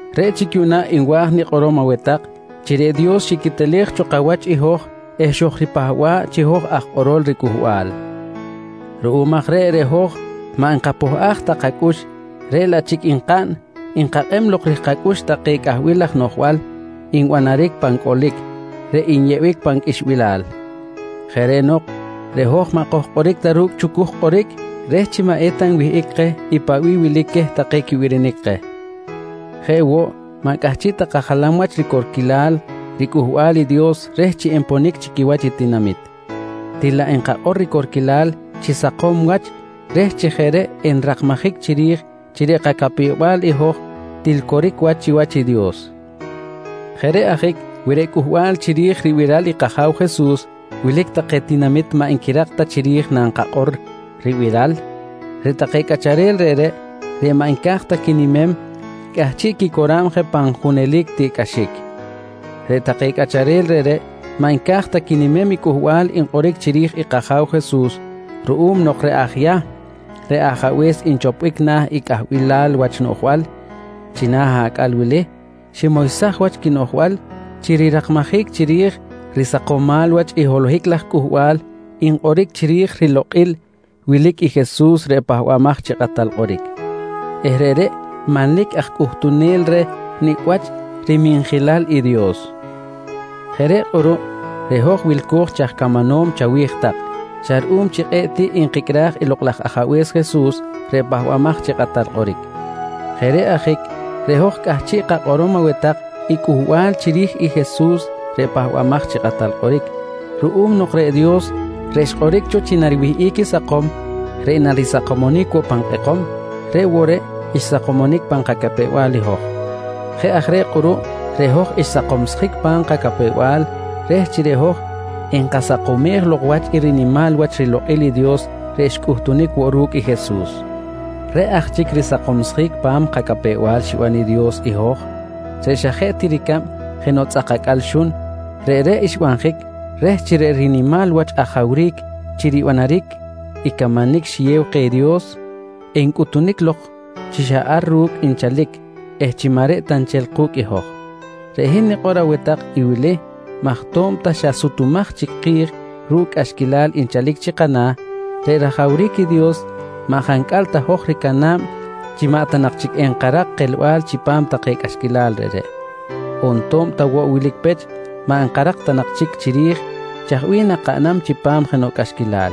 Reꞌ chic yuꞌna nwa̱j nikꞌorom aweh tak chi reꞌ Dios xiquetelej cho kawach i hoj eh xojripahba̱ꞌ chi hoj aj kꞌorol riCꞌuhbal. Ruꞌum aj reꞌ, reꞌ hoj maꞌ nkapohꞌaj ta kacꞌux reꞌ laꞌ chic nkaꞌn nkakꞌeb lok ri̱j-kacꞌux take cꞌahbil laj noꞌjbal nbanaric pan cꞌolic reꞌ nyeꞌbic pan qꞌuixbilal. Jeꞌ reꞌ nok reꞌ hoj maꞌ kojkꞌoric ta ru̱cꞌ chucuj kꞌoric reh chi maꞌ eta nwihꞌic keh i paꞌ bih wilic queh take i quibirinic keh. Jeꞌ woꞌ maꞌ cꞌahchiꞌ ta kajalam wach ricorquilal riCꞌuhbal i Dios reh chi enponic chi quiwach i tinamit. Til laꞌ nkakꞌor ricorquilal chi sakom wach reh chi jeꞌ reꞌ enrakmajic chiri̱j chi reꞌ kacapew-bal i hoj til coric wach chiwach i Dios. Jeꞌ reꞌ ajic wi reꞌ cꞌuhbal chiri̱j ribiral i kAja̱w Jesus wilic take tinamit maꞌ nquirak ta chiri̱j nankakꞌor ribiral, reꞌ take cꞌacharel reꞌreꞌ, reꞌ maꞌ nca̱j ta quinimem, cꞌahchiꞌ quicora̱b je pan junelic tiꞌcꞌaxic. Reꞌ take cꞌacharel reꞌreꞌ maꞌ nca̱j ta quinimem i cꞌuhbal nkꞌoric chiri̱j i kAja̱w Jesus ruꞌum nok reꞌ aj Yahm reꞌ ajabe̱s nchoponic na̱ i cꞌahbilal wach noꞌjbal china̱ acꞌal ximoysaj wach quinoꞌjbal chi rirakmajic chiri̱j risakomal wach i holohic laj cꞌuhbal nkꞌoric chiri̱j rilokꞌil wilic i Jesus reꞌ Pahbamaj chi Kꞌatal Kꞌoric eh reꞌreꞌ manlic aj cꞌuhtunel reh nicꞌ wach riminjilal i Dios. Jeꞌ reꞌ kꞌuruꞌ reꞌ hoj wilco̱j chi aj camanom chawi̱j xa ruꞌum chi kꞌe̱ꞌ tiꞌ nkicꞌraj i Lokꞌ laj Ajabe̱s Jesus reꞌ Pahbamaj chi Kꞌatal Kꞌoric. Jeꞌ reꞌ ajic reꞌ hoj cꞌahchiꞌ kakꞌorom aweh tak i cꞌuhbal chiri̱j i Jesus reꞌ Pahbamaj chi Kꞌatal Kꞌoric, ruꞌum nok reꞌ Dios reꞌ xkꞌoric cho chi nariwihꞌic i sakom reꞌ narisakomonic woꞌ pan kꞌekom, reꞌ woꞌ reꞌ xsakomsjic pan kacapew-bal i hoj. Jeꞌ aj reꞌ kꞌuruꞌ reꞌ hoj xsakomsjic pa̱m kacapew-bal reh chi reꞌ hoj enkasakomej lok wach i rinimal wach rilokꞌil i Dios reꞌ xcꞌuhtunic woꞌ ru̱cꞌ i Jesus. Reꞌ aj chic risakomsjic pa̱m kacapew-bal xiban i Dios i hoj reꞌ xa jeꞌ ti ricab jenoꞌ tzꞌak acꞌal xun, reꞌreꞌ xbanjic reh chi reꞌ rinimal wach ajawric chi ribanaric i camanic xiyew keh i Dios, encꞌutunic lok chi ar ru̱cꞌ nchalic eh chi maꞌ reꞌ ta nchel ku̱cꞌ i hoj. Reꞌ hin nikꞌor aweh tak i wili maj to̱b ta xa sutumaj chic ki̱j ru̱cꞌ cꞌaxquilal nchalic chi kana̱, reꞌ rajawric i Dios maꞌ jancꞌal ta hoj ricana̱b chi maꞌ ta nak chic enkarak kelbal chipam take cꞌaxquilal reꞌreꞌ, on to̱b ta woꞌ wilic pech maꞌ nkarak ta nak chic chiri̱j chaj bih nakaꞌnam chipam jenoꞌ cꞌaxquilal,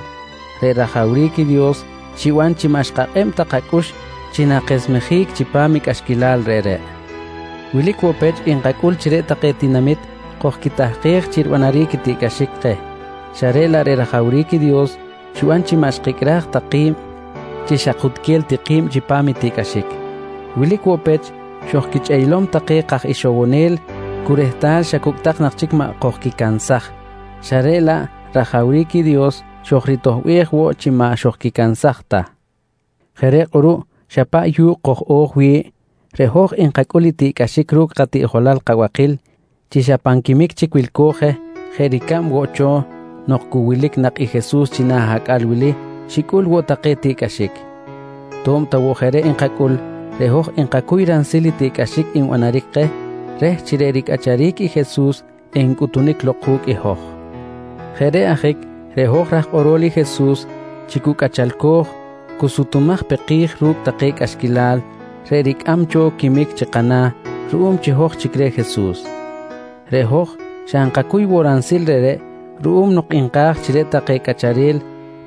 reꞌ rajawric i Dios xiban chi maꞌ xkakꞌeb ta kacꞌux chi nakesmejic chipam i cꞌaxquilal reꞌreꞌ. Wilic woꞌ pech nkacꞌul chi reꞌ take tinamit kojquitahkej chi ribanaric tiꞌcꞌaxic keh xa reꞌ laꞌ reꞌ rajawric i Dios xiban chi maꞌ xkicꞌraj tak ki̱b chi xakutquel ti ki̱b chipam i tiꞌcꞌaxic. Wilic woꞌ pech xojquichꞌeylom take kaj ixowonel cu rehtal xa cucꞌtak nak chic maꞌ kojquicansaj xa reꞌ laꞌ rajawric i Dios xojritoꞌbej woꞌ chi maꞌ xojquicansaj ta. Jeꞌ reꞌ kꞌuruꞌ xa paꞌ yu̱kꞌ koj-o̱j wi̱ꞌ, reꞌ hoj nkacꞌul i tiꞌcꞌaxic ru̱cꞌ katiꞌjolal kabakil chi xa pan quimic chic wilco̱j je jeꞌ ricab woꞌ cho nok cu wilic nak i Jesus china̱ acꞌal wili xicꞌul woꞌ take tiꞌcꞌaxic. To̱b ta woꞌ jeꞌ reꞌ nkacꞌul reꞌ hoj nkacuy ransil i tiꞌcꞌaxic nbanaric keh reh chi reꞌ ricꞌacharic i Jesus encꞌutunic lok ku̱cꞌ i hoj. Jeꞌ reꞌ ajic reꞌ hoj raj kꞌorol i Jesus chi cu cꞌachalco̱j, cu sutumaj pe ki̱j ru̱cꞌ take cꞌaxquilal reꞌ ricꞌam cho quimic chi kana̱ ruꞌum chi hoj chic reh Jesus. Reꞌ hoj xa nkacuy woꞌ ransil reꞌreꞌ ruꞌum nok nka̱j chi reꞌ take cꞌacharel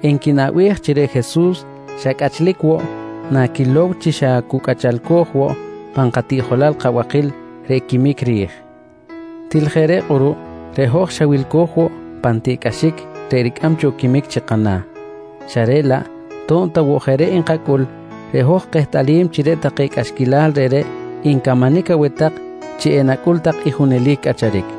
enquinaꞌbej chi reꞌ Jesus xa cꞌachlic woꞌ naquilow chi xa cu cꞌachalco̱j woꞌ pan katiꞌjolal kabakil reꞌ quimic ri̱j. Til jeꞌ reꞌ kꞌuruꞌ reꞌ hoj xa wilco̱j woꞌ pan tiꞌcꞌaxic reꞌ ricꞌam cho quimic chi kana̱ xa reꞌ laꞌ to̱b ta woꞌ jeꞌ reꞌ nkacꞌul reꞌ hoj kehtꞌalim chi reꞌ take cꞌaxquilal reꞌreꞌ ncamanic aweh tak chi enacꞌul tak i junelic cꞌacharic.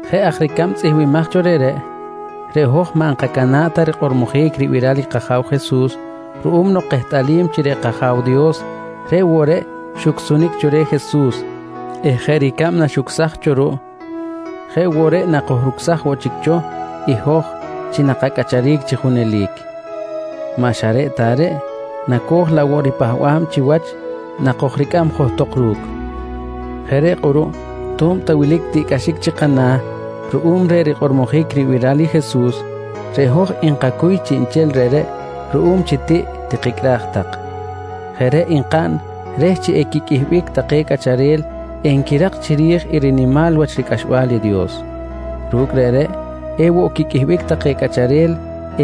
Jeꞌ aj ricab i tzꞌihmbimaj cho reꞌreꞌ, reꞌ hoj maꞌ nkacana̱ꞌ ta rikꞌormojic ribiral i kAja̱w Jesus ruꞌum nok kehtꞌalim chi reꞌ kAja̱w Dios reꞌ woꞌ reꞌ xucsunic cho reh i Jesus eh jeꞌ ricab naxucsaj cho ruꞌ jeꞌ woꞌ reꞌ nakojrucsam woꞌ chic cho i hoj chi nakacꞌacharic chi junelic. Maꞌ xa reꞌ ta reꞌ, nacoj laꞌ woꞌ ripahba̱b chiwach nakojricꞌam johtok ru̱cꞌ. Jeꞌ reꞌ kꞌuruꞌ to̱b ta wilic tiꞌcꞌaxic chi kana̱ ruꞌum reh rikꞌormojic ribiral i Jesus, reꞌ hoj nkacuy chiꞌnchel reꞌreꞌ ruꞌum chi tiꞌ tikicꞌraj tak. Jeꞌ reꞌ nkaꞌn reh chi equiqꞌuihbic take cꞌacharel enquirak chiri̱j i rinimal wach ricꞌaxbal i Dios. Ru̱cꞌ reꞌreꞌ ewoꞌ quiqꞌuihbic take cꞌacharel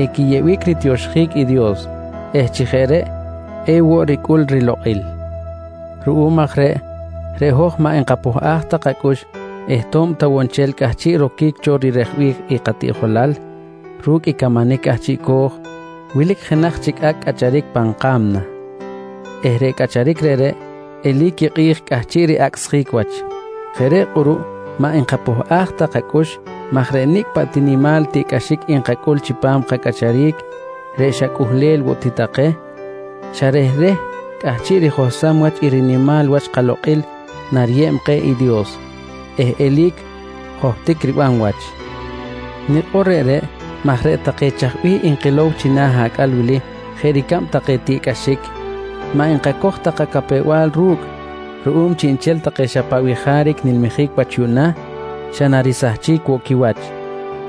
equiyeꞌbic ritioxjic i Dios eh chi jeꞌ reꞌ ewoꞌ ricꞌul rilokꞌil. Ruꞌum aj reꞌ, reꞌ hoj maꞌ nkapohꞌaj ta kacꞌux eh to̱b ta woꞌ nchel cꞌahchiꞌ roquic cho rirejbic i katiꞌjolal ru̱cꞌ i camanic cꞌahchiꞌco̱j, wilic jenaj chic acꞌ cꞌacharic pan ka̱mna eh reꞌ cꞌacharic reꞌreꞌ eli̱c i kꞌi̱j cꞌahchiꞌ riꞌacsjic wach. Jeꞌ reꞌ kꞌuruꞌ maꞌ nkapohꞌaj ta kacꞌux maj reꞌ nicꞌ paꞌ ti nimal tiꞌcꞌaxic nkacꞌul chipam kacꞌacharic reꞌ xa cꞌuhlel woꞌ ti take, xa rehreh cꞌahchiꞌ rijohsam wach i rinimal wach kalokꞌil nariyeb keh i Dios eh eli̱c johtic riban wach. Nikꞌor reꞌreꞌ maj reꞌ take chaj bih nkilow china̱ acꞌal wili jeꞌ ricab take tiꞌcꞌaxic, maꞌ nkacoj ta kacapew-bal ru̱cꞌ ruꞌum chiꞌnchel take xa chaj bih jaric nilmijic wach yuꞌna xa narisahchic woꞌ quiwach,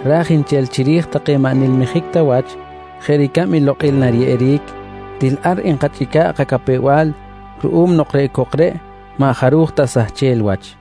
ra̱j nchel chiri̱j take maꞌ nilmijic ta wach jeꞌ ricab i lokꞌil nariyeꞌeric, til ar nkachꞌica̱ꞌ kacapew-bal ruꞌum nok reꞌ cok reꞌ maꞌ jaruj ta sahchel wach.